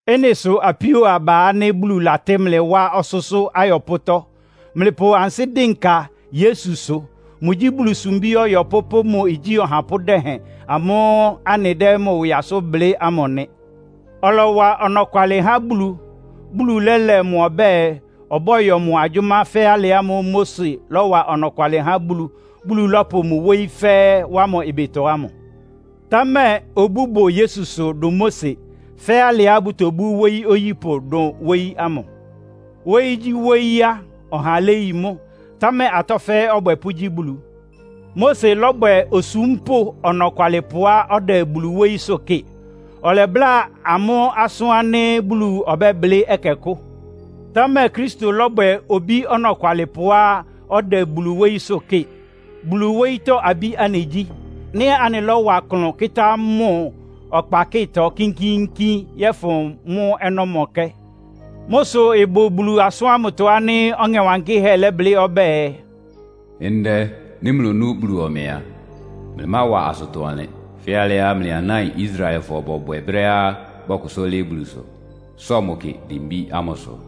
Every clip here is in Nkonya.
Ɩ́nɩ sʋ apíó aba ánɩ́ Bulu latɩ́ mlɩ wá ɔsʋ́sʋ́ ayɔpʋ́tɔ́, mlɩpʋ ansɩ́ dɩnka Yesusʋ. Mʋgyí Bulu sumbí ɔyɔpʋ́ pʋ́ mʋ igyí ɔhapʋ́ dɛhɛn amʋ́ʋ́ anɩdɛ́ mʋ ɩwɩ asʋ́n blɩ́ ámʋ nɩ. Ɔlɔwa ɔnɔkwalɩ há Bulu, Bulu lɛ́lɛ mʋ ɔbɛ́ɛ, ɔbɔ́yɔ mʋ agyʋ́má fɛ́ alɩ ámʋ́ʋ́ Mose lɔ́wa ɔnɔkwalɩ há Bulu, Bulu lɔ́pʋ mʋ wóyí fɛ́ɛ́ wá mʋ ɩbɩtɔ ámʋ. Támɛ obú bʋ Yesusʋ dʋn Mose, fɛ́ alɩá bʋtobú wóyí oyípʋ dʋn wóyí ámʋ. Wóyígyíwóyí á, ɔha léyi mʋ́, támɛ atɔ́ fɛ́ɛ́ ɔbwɛpʋ́ gyí Bulu. Mose lɔ́bwɛ osúmpʋ́ ɔnɔkwalɩpʋá ɔdɛ Bulu wóyísʋ́ kɩ́ɩ. Ɔlɛbláa amʋ́ asʋ́n ánɩ́ Bulu ɔbɛ́blɩ́ ɛkɛkʋ́. Támɛ Kristo lɔ́bwɛ obí ɔnɔkwalɩpʋá ɔdɛ Bulu wóyísʋ́ kɩ́ɩ. Bulu wóyítɔ́ abí anɩgyí, nɩ́ anɩlɔ́wa klʋn kɩ́tá mʋ ɔkpakɩ́tɔ kínkíínkín yɔ́fʋn mʋ́ ɔnɔ́mɔkɛ́. Mʋ́ sʋ ɩbʋ Bulu asʋ́n ámʋtɔ ánɩ́ Ɔŋɛ Wankɩ́hɛ́ lɛ́blɩ́ ɔbɛ́ɛ, “Ndɛ, nɩ́ mlonú Bulu ɔmɛ a, mlɩmáwa asʋtɔ-ɔnlɩn, fɛ́ alɩá mlɩ anáin Israelfɔ bɔbwɛ brɛ́á bɔkʋsʋ́ lɩ́ɩ́ Bulusʋ, sɔ mʋ kɩ dimbí ámʋsʋ.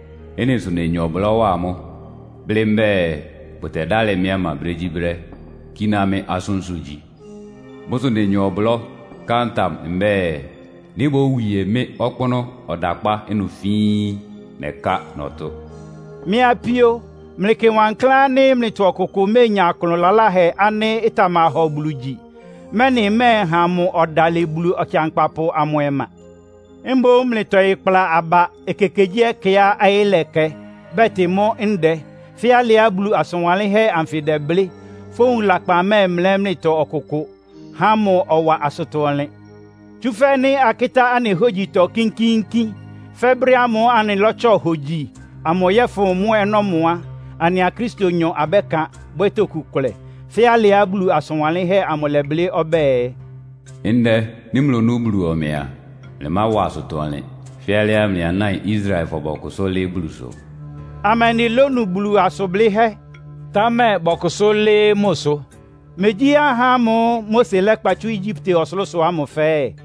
Ɩ́nɩ sʋ nenya ɔblɔ́ wa amʋ́, blɩ́ mbɛ́ɛ, ‘Bʋtɛdálɩ mɩ́ ɔma brégyíbrɛ́, kíná mɩ́ asʋ́nsʋ́ gyí.’ Mʋ́ sʋ nenya ɔblɔ́ ká ntam mbɛ́ɛ, ‘Nɩ́ bówie mɩ́ ɔkpʋ́nʋ́ ɔdakpá ɩnʋ fíín! Nɛká nɔtʋ́n!’” Mɩ́ apíó, mlɩkɩ wankláán ánɩ́ mlɩtɔ ɔkʋkʋ méenya klʋn laláhɛ ánɩ́ ɩtamahɔ Bulu gyi, mɛ́nɩ ɩmɛ́ɛha mʋ ɔdalɩ Bulu Ɔkɩankpapʋ amʋ ɔma. Mboún mlɩtɔɩ kpla aba ekekegyíɛkɛá ɔyɩ́ lɛkɛ, bɛtɩ mʋ́ “Ndɛ,” fɛ́ alɩá Bulu asʋn wanlɩ́nhɛ́ anfɩ ɩdɛblɩ́. Fówun lakpan mɛ́ɛmlɛ́ mlɩtɔ ɔkʋkʋ, há mʋ ɔwa asʋtɔ-ɔnlɩn. Tsúfɛ́ nɩ́ akɩ́tá anɩ hógyitɔ kínkíínkín, fɛ́ brɛ́ ámʋ́ʋ́ anɩlɔ́tsɔ hógyi amʋ yɔ́fʋn mʋ́ ɔnɔ́mɔ a, anɩa Kristonyɔ abɛ́kan, bwɛ́ toku kʋlɛ. Fɛ́ alɩá Bulu asʋn wanlɩ́nhɛ́ amʋ lɛ́blɩ́. Ɔbɛ́ɛ, “Ndɛ, nɩ́ mlonú Bulu ɔmɛ a, mlɩmáwa asʋtɔ-ɔnlɩn, fɛ́ alɩá mlɩ anáin Israelfɔ bɔkʋsʋ́ lɩ́ɩ́ Bulusʋ.” Amɛndɩ lónu Bulu asʋn blɩ́hɛ́, támɛ bɔkʋsʋ́ lɩ́ɩ́ mʋsʋ? Megyí ahá ámʋ́ʋ́ Mose lɛ́kpa tsú Egyipte ɔsʋlʋ́sʋ ámʋ fɛ́ɛ́?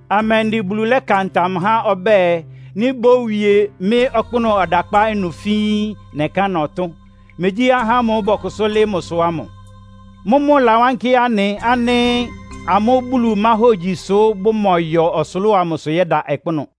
Amɛndɩ Bulu lɛ́ka ntam há ɔbɛ́ɛ, “Nɩ́ bówie mɩ́ ɔkpʋ́nʋ́ ɔdakpá ɩnʋ fíín! Nɛká nɔtʋ́n?” Megyí ahá ámʋ́ʋ́ bɔkʋsʋ́ lɩ́ɩ́ mʋsʋ ámʋ? Mʋ́mʋ́ ɩlawánkɩ́ anɩ ánɩ́ amʋ́ Bulu máhógyi sʋ́ bʋmɔyɔ ɔsʋlʋ́ʋ amʋsʋ yɛ́da ɔkpʋ́nʋ́.